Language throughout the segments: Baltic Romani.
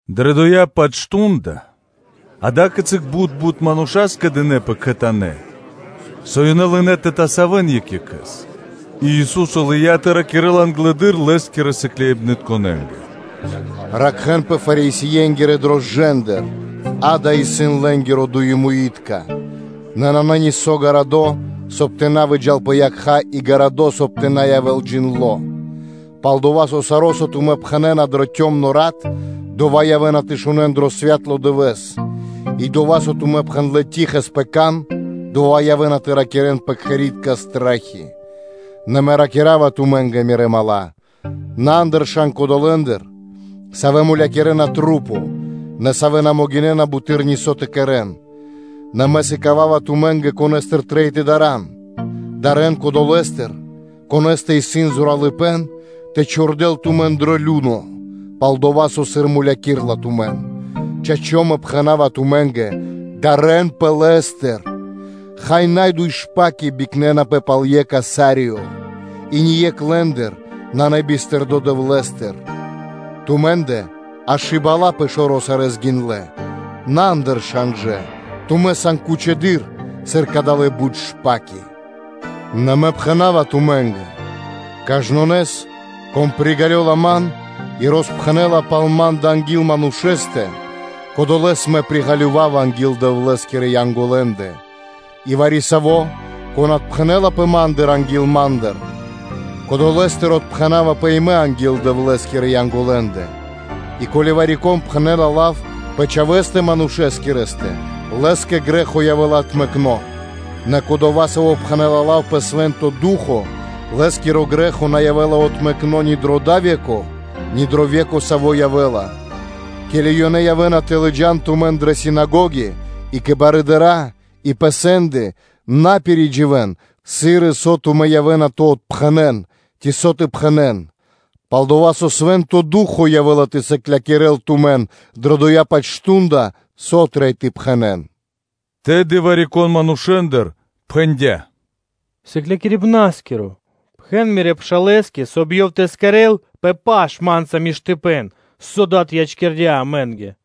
Дрэ дова́-паць мардо́ (шту́нда) ада́кицы бут мануша́ скэдынэ́пэ кхэтанэ́, со ёнэ лынэ́ тэ тасавэн екх екхэ́с, и Ису́со лыя́ тэ ракирэ́л англэды́р Лэ́скирэ сыкляибнытконэ́нгэ: “Ракхэ́нпэ Фарисиенгирэ рошчынатыр: ракхэ́нпэ лэ́нгирэ дуемуиткиматыр; нэ нанэ нисо́ учхакирдо, соб (кай) тэ на выджа́л пэ якха́ и гарадо́, соб (кай) тэ на явэ́л джиндло́; пал-дова́ со саро́, со тумэ́ пхэнэ́на дрэ калы (цямлы) рат, дова́ явэ́на тэ шунэ́н дро святло дывэ́с, и дова́, со тумэ́ пхэндлэ́ штылэ́с (тихэс) пэ кан, дова́ явэ́на тэ ракирэ́н пэ кхэри́тка стрэхи. Нэ Мэ ракира́ва тумэ́нгэ, Мирэ́ дру́ги (мала́): “На андыршан кодолэндыр, савэ́ мулякирэна тумэн, нэ савэ́ на могинэ́на буты́р нисо́ тэ кэрэ́н. Нэ Мэ сыкава́ва тумэ́нгэ, конэ́стыр трэй тэ дарэ́н: дарэ́н кодолэстыр, конэ́стэ исын зоралыпэ́н тэ чхурдэл тумэн дро геена. Чачо́, Мэ пхэна́ва тумэ́нгэ: дарэнпэ лэ́стыр! Хай, на дуй шпаки бикнэнапэ пал екх асарие? И ни екх лэ́ндыр нанэ бистырдо Дэвлэ́стэ. Тумэ́ндэ аж и бала́ пэ шэро́ сарэ́ гиндлэ́. На андыршан жа: тумэ́ сан кучыдыр, сыр кадалэ́ бут шпаки. Нэ Мэ пхэна́ва тумэ́нгэ: кажнонэс, кон приґалёла Ман и роспхэнэ́ла пал Ма́ндэ анги́л манушэ́стэ, кодолэ́с Мэ приґалёвава анги́л Дэвлэ́скирэ Янголэндэ; и вари-саво́, кон отпхэнэлапэ Ма́ндыр анги́л манушэ́ндэ, кодолэстыр отпхэнавапэ и Мэ анги́л Дэвлэ́скирэ Янголэндэ; и ко́ли вари-кон пхэнэ́ла лав пэ Чхавэ́стэ Манушэскирэстэ, лэ́скэ грэ́хо явэ́ла отмэкно, нэ кодова́, саво́ пхэнэ́ла лав пэ Свэ́нто Ду́хо (Фа́но), лэ́скиро грэ́хо на явэ́ла отмэкно ни дро дава́ ве́ко, ни дро ве́ко, саво́ явэ́ла. Ке́ли ёнэ явэ́на тэ лыджа́н тумэн дрэ синагоги и кэ барыдыра́ и пэ сэнды, на пиридживэн, сыр и со тумэ́ явэ́на тэ отпхэнэн, ци со тэ пхэнэ́н; пал-дова́ со Свэ́нто Ду́хо (Фа́но) явэ́ла тэ сыклякирэ́л тумэн дрэ дова́-паць мардо́, со трэй тэ пхэнэ́н. Тэды вари-кон манушэ́ндыр пхэндя́: “Сыклякирибнарискиро! Пхэн Мирэ́ пшалэ́скэ, соб (кай) ёв тэ росчхувэл пир паша́ (тэ улавэ́л) ма́нца мэкно́ миштыпэ́н, со дад ячкирдя́ амэ́нгэ.”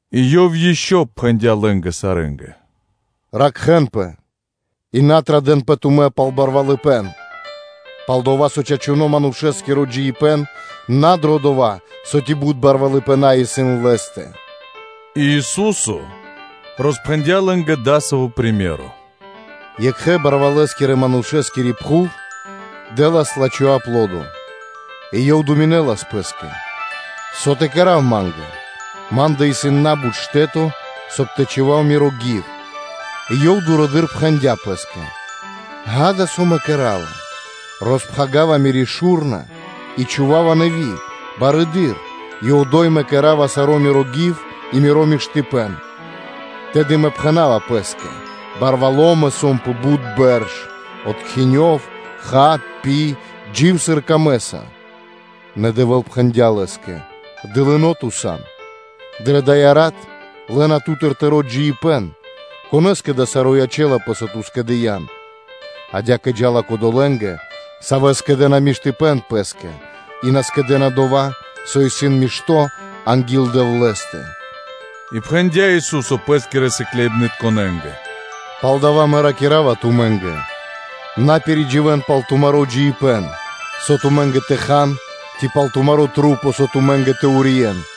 И Ёв ишчо (инкэ́) пхэндя́ лэ́нгэ сарэ́нгэ: “Ракхэ́нпэ и на традэнпэ тумэ́ пал барвалыпэ́н, пал-дова́ со чачуно́ Манушэ́скиро джиибэ́н на дро дова́, со ци бут барвалыпэна исын лэ́стэ.” И Ису́со роспхэндя́ лэ́нгэ дасаво приме́ро: “Екхэ-барвалэскирэ манушэскири пхув дэ́лас лачхо́ аплодо: и ёв думинэлас пэ́скэ: ‘Со тэ кэра́в ма́нгэ? Ма́ндэ исын на́бут штэ́то, соб (кай) тэ чхував миро гив.’ И ёв дурэды́р пхэндя́ пэ́скэ: ґа́да, со мэ кэра́ва? Роспхагирава мири́ шу́рна и чхува́ва нэви́ шу́рна барэды́р, и одо́й мэ кэдава саро́ миро гив и миро миштыпэ́н: Тэды мэ пхэна́ва пэ́скэ: ‘Барвало́ мэ сом пэ бут бэрш: откхинёв, ха, пи, джив, сыр камэ́са.’ Нэ Дэвэ́л пхэндя́ лэ́скэ: ‘Дылыно́ ту сан! Дрэ дая́ рат лэ́на ту́тыр тыро́ джиибэ́н; конэ́скэ дава́ саро́ ячэ́лапэ, со ту скэдыян?’ Адя́кэ джа́ла кодолэндэ, савэ́ скэдэ́на кучипэ́н пэ́скэ, а на скэдэ́на дова́, со исын мишто́ анги́л Дэвлэ́стэ.” И пхэндя́ Ису́со Пэ́скирэ сыкляибнытконэ́нгэ: “Палдава́ Мэ ракира́ва тумэ́нгэ: на пиридживэн пал тумаро́ джиибэ́н, со тумэ́нгэ тэ хан, ци пал тумарэ́ маса́, со тумэ́нгэ тэ урьен: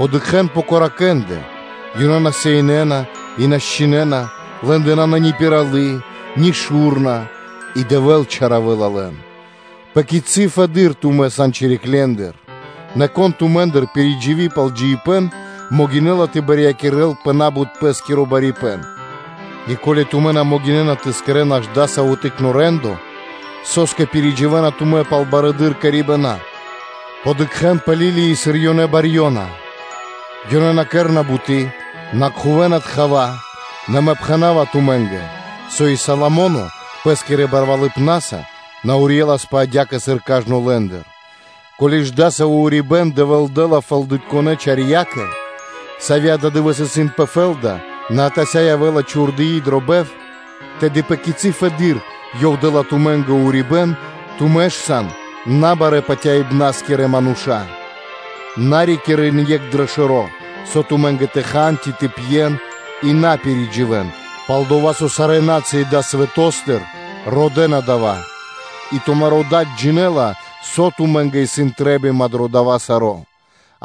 Дыкхэ́н пэ коракэндэ (воронэндэ), ёнэ на чхувэ́на дрэ пхув и на счхинэна; лэ́ндэ нанэ ни пиралы́, ни шу́рна; и Дэвэ́л чалякирэла лэн. Пэ кицы́ фэдыдыр тумэ́ сан чириклендыр? Нэ кон тумэ́ндыр пиридживи пал джиибэ́н, могинэ́ла тэ барьякирэл пэ на́бут пэ́скиро барипэ́н? И ко́ли тумэ́ на могинэ́на тэ кэрэ́н аж дасаво тыкно́ рэндоро, со́скэ пиридживэна тумэ́ пал яви́р кэрибэна? Дыкхэ́н пэ лилии, сыр ёнэ барьёна: ёнэ на кэрэ́на буты́, на кхувэна тхава; нэ Мэ пхэна́ва тумэ́нгэ, со и Соломо́но пэ́скирэ барвалыпнаса на урьеласпэ адя́кэ, сыр кажно лэ́ндыр. Ко́ли ж дасаво урибэ́н Дэвэ́л дэ́ла фэлдытконэ чарьякэ, сави́ ададывэ́с исын пэ фэ́лда, нэ атася́ явэ́ла чхурдыны дро бов, тэды пэ кицы́ фэды́р Ёв дэ́ла тумэ́нгэ урибэ́н, тумэ́ ж сан набарэ́ – патяибнаскирэ мануша́? На рикирэ́н екх дро шэро́, со тумэ́нгэ тэ хан ци тэ пьен, и тумэ́ на пиридживэн; пал-дова́ со сарэ́ на́цыи далэ́ свэто́стыр родэ́на дава́, и тумаро́ Дад джинэ́ла, со тумэ́ндэ исын трэ́бима дро дава́ саро́;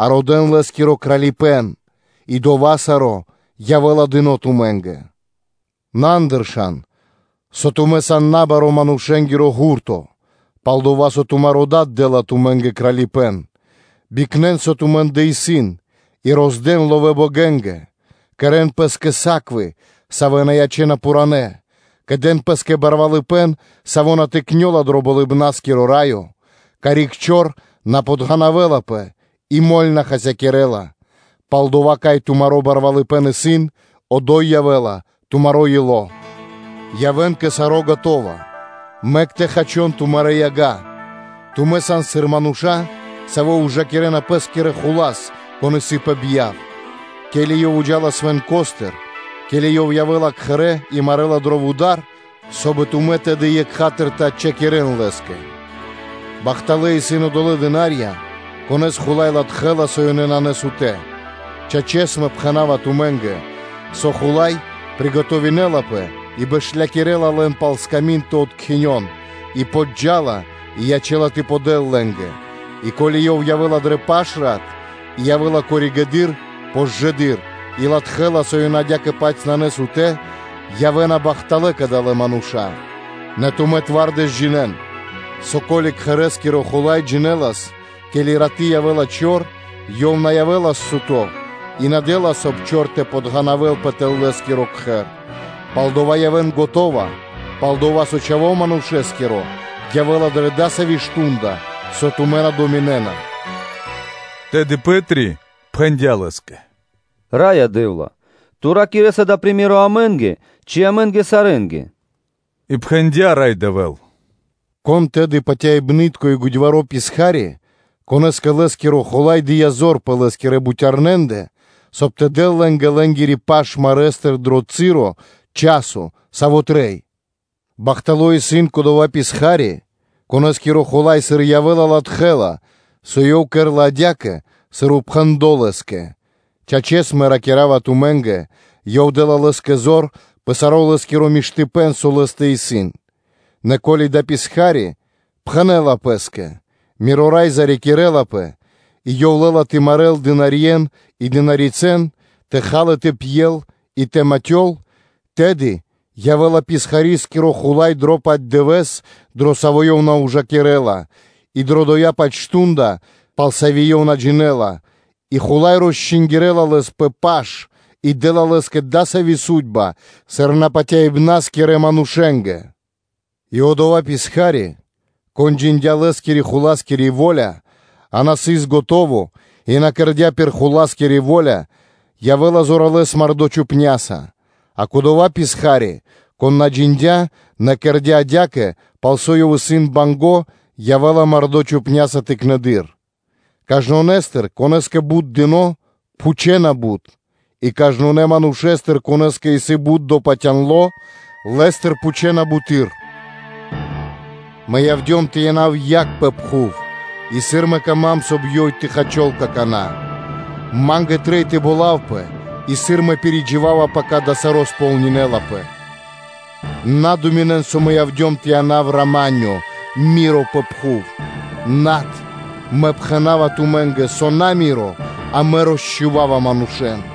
а родэ́н Лэ́скиро Кралипэ́н, и дова́ саро́ явэ́ла дыно́ тумэ́нгэ. На андыршан, со тумэ́ сан на баро́ манушэ́нгиро ґурто, пал-дова́ со тумаро́ Дад дэ́ла ласкаса тумэ́нгэ Кралипэ́н. Бикнэн, со тумэ́ндэ исын и роздэн ловэ́ богэнгэ; кэрэ́н пэ́скэ муе́нгирэ (кошэльки), савэ́ на ячэ́на пхуранэ́, кэдэн пэ́скэ кучипэ́н, саво́ на тыкнёла дро Болыбна́скиро Раё, карик чор на подганавэлапэ, и моль (мэль) на хасякирэ́ла. Палдова́, кай тумаро́ кучипэ́н исын, одо́й явэ́ла тумаро́ ило́. Явэ́н скэдынэ́ кэ саро́, мэк тэ хачон тумарэ́ яга; тумэ́ сан сыр мануша́, савэ́ ужакирэ́на пэ́скирэ хула́с, кон исын пэ бьяв, ке́ли ёв джа́ла палэ свэнкостыр, ке́ли ёв явэ́ла кхэрэ́ и марэла дро вуда́р, соб (кай) тумэ́ тэды екха́тыр тэ отчхакирэн лэ́скэ. Бахталэ́ исын одолэ́ дына́рья, конэ́с хула́й латхэ́ла, со ёнэ на сутэ́; чачэс, Мэ пхэна́ва тумэ́нгэ, со хула́й приготовинэлапэ и бэшлякирэла лэн пал сками́нд тэ откхинён; и джа́ла кэ ёнэ и ячэ́ла тэ подэл лэ́нгэ. И, ко́ли ёв явэ́ла дрэ пашрат, и явэ́ла коригэды́р (позжэды́р), и латхэ́ла, со ёнэ адя́кэ-паць исын на сутэ́, явэ́на бахталэ́ кадалэ́ мануша́. Нэ тумэ́ зоралэ́с джинэ́н, со, ко́ли кхэрэ́скиро хула́й джинэлас, ке́ли раты́ явэ́ла чор, ёв явэ́ла тэ ракхэлпэ и на дэ́лас, соб (кай) чор тэ подґанавэлпэ тэл лэ́скиро кхэр. Палдава́ явэ́н скэдынэ́, пал-дова́ со Чхаво́ Манушэ́скиро явэ́ла дрэ дасаво мардо́ (шту́нда), со тумэ́ на думинэ́на.” Тэды Пэ́три пхэндя́ Лэ́скэ: “Раё Дэ́вла! Ту ракирэ́са дава́ приме́ро (сыкаибэ́н) амэ́нгэ ци сарэ́нгэ?” И пхэндя́ Рай Дэвэ́л: “Кон тэды исын патяибны́тко и годьваро́ писха́ри, конэ́скэ лэ́скиро хула́й дыя́ зор пэ лэ́скирэ бутярнэндэ, соб (кай) тэ дэл лэ́нгэ лэ́нгири паш марэстыр дро часо, саво́ трэй? Бахтало́ исын кодова́ писха́ри, конэ́скиро хула́й сыр явэ́ла, латхэ́ла, со ёв кэрэ́ла адя́кэ, сыр упхэндло́ лэ́скэ; чачэс, Мэ ракира́ва тумэ́нгэ: ёв дэ́ла лэ́скэ право пэ саро́ лэ́скиро миштыпэ́н, со исын лэ́стэ. Нэ ко́ли дава́ писха́ри пхэнэ́ла пэ́скэ: ‘Миро рай зарикирэлапэ;’ и ёв лэ́ла тэ марэл дынарье́н и дынарицэн, тэ хал и тэ пьел, и тэ матёл, тэды явэ́ла писхарискиро хула́й дро дова́-паць дывэ́с, дро саво́ ёв на ужакирэ́ла: и дро дова́-паць мардо́, пал саво́ ёв на джинэ́ла и хула́й росчингирэла лэс пэ паш и дэ́ла лэ́скэ дасави́ судьба, сыр напатяибнаскирэ манушэ́нгэ. И одова́ писха́ри, кон джиндя́ лэ́скирэ хуласкири во́ля, а на сыс скэдыно́ и на кэрдя́ пир хуласкири во́ля, явэ́ла зоралэ́с мардо́ чупняса, а кодова́ писха́ри, кон на джиндя́, нэ кэрдя́ адя́кэ, пал со ёв исын банго́, явэ́ла мардо́ чхупняса тыкнэды́р. Кажнонэстыр, конэ́скэ бут дыно́, пхучэна бут; и кажнонэ́ манушэ́стыр, конэ́скэ исын бут допатяндло, лэ́стыр пхучэна буты́р. Мэ явдём тэ янав яг пэ дая́ пхув; и сыр Мэ кама́м, соб (кай) ёй тэ хачол какана́? Ма́нгэ трэй тэ болавпэ, и сыр Мэ пиридживава, пака дава́ саро́ сполнинэлапэ! На думинэн, со Мэ явдём тэ янав рама́нё (миро) пэ пхув? Над, Мэ пхэна́ва тумэ́нгэ, со на рама́нё (миро), а Мэ явдём тэ росчхував манушэ́н: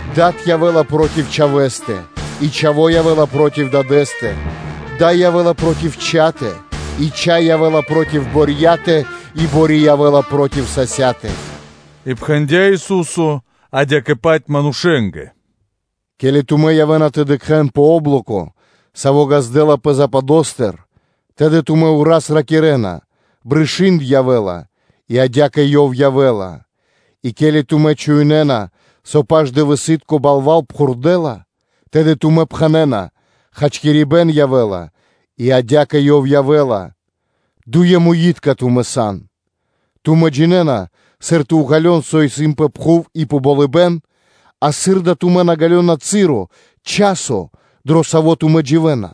дад явэ́ла проти чхавэ́стэ, и чхаво́ явэ́ла проти дадэ́стэ; дай явэ́ла проти чхатэ, и чхай явэ́ла проти борьятэ, и бори явэ́ла проти сасятэ.” И пхэндя́ Ису́со адя́кэ-паць манушэ́нгэ: “Ке́ли тумэ́ явэ́на тэ дыкхэ́н о́блоко, саво́ ґаздэ́лапэ западостыр (пал-панендыр), тэды тумэ́ ўраз ракирэ́на: ‘Брышы́нд явэ́ла; и адя́кэ ёв явэ́ла.’ И ке́ли тумэ́ чуинэна (шунэ́на), со паш-дывэсы́тко балва́л пхурдэла, тэды тумэ́ пхэнэ́на: ‘Хачкирибэ́н явэ́ла;’ и адя́кэ ёв явэ́ла. Дуемуитка, тумэ́ сан! Тумэ́ джинэ́на, сыр тэ уґалён, со исын пэ пхув и пэ болыбэ́н; а сыр да тумэ́ на ґалёна часо, дро саво́ тумэ́ дживэ́на.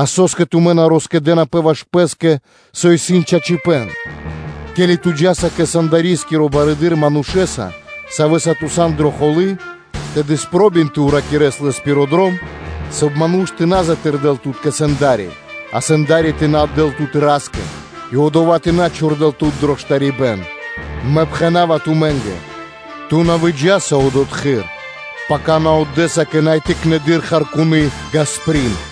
А со́скэ тумэ́ на роскэдэнапэ ваш пэ́скэ, со исын чачипэ́н? Ке́ли ту джа́са кэ сэндоскиро барыдыро́ манушэ́са, савэ́са ту сан дрэ холы́, тэды спробин тэ уракирэс лэс пир дром, соб (кай) ману́ш тэ на затырдэл тут кэ сэнда́ри, а сэнда́ри тэ на отдэ́л тут фандари́скэ (истязателёскэ), и одова́ тэ на чхурдэл тут дро штарибэ́н. Мэ пхэна́ва тумэ́нгэ: ту на выджаса одотхы́р, пака ту отдэса кэ най тыкнэды́р харкуны ґасприн.”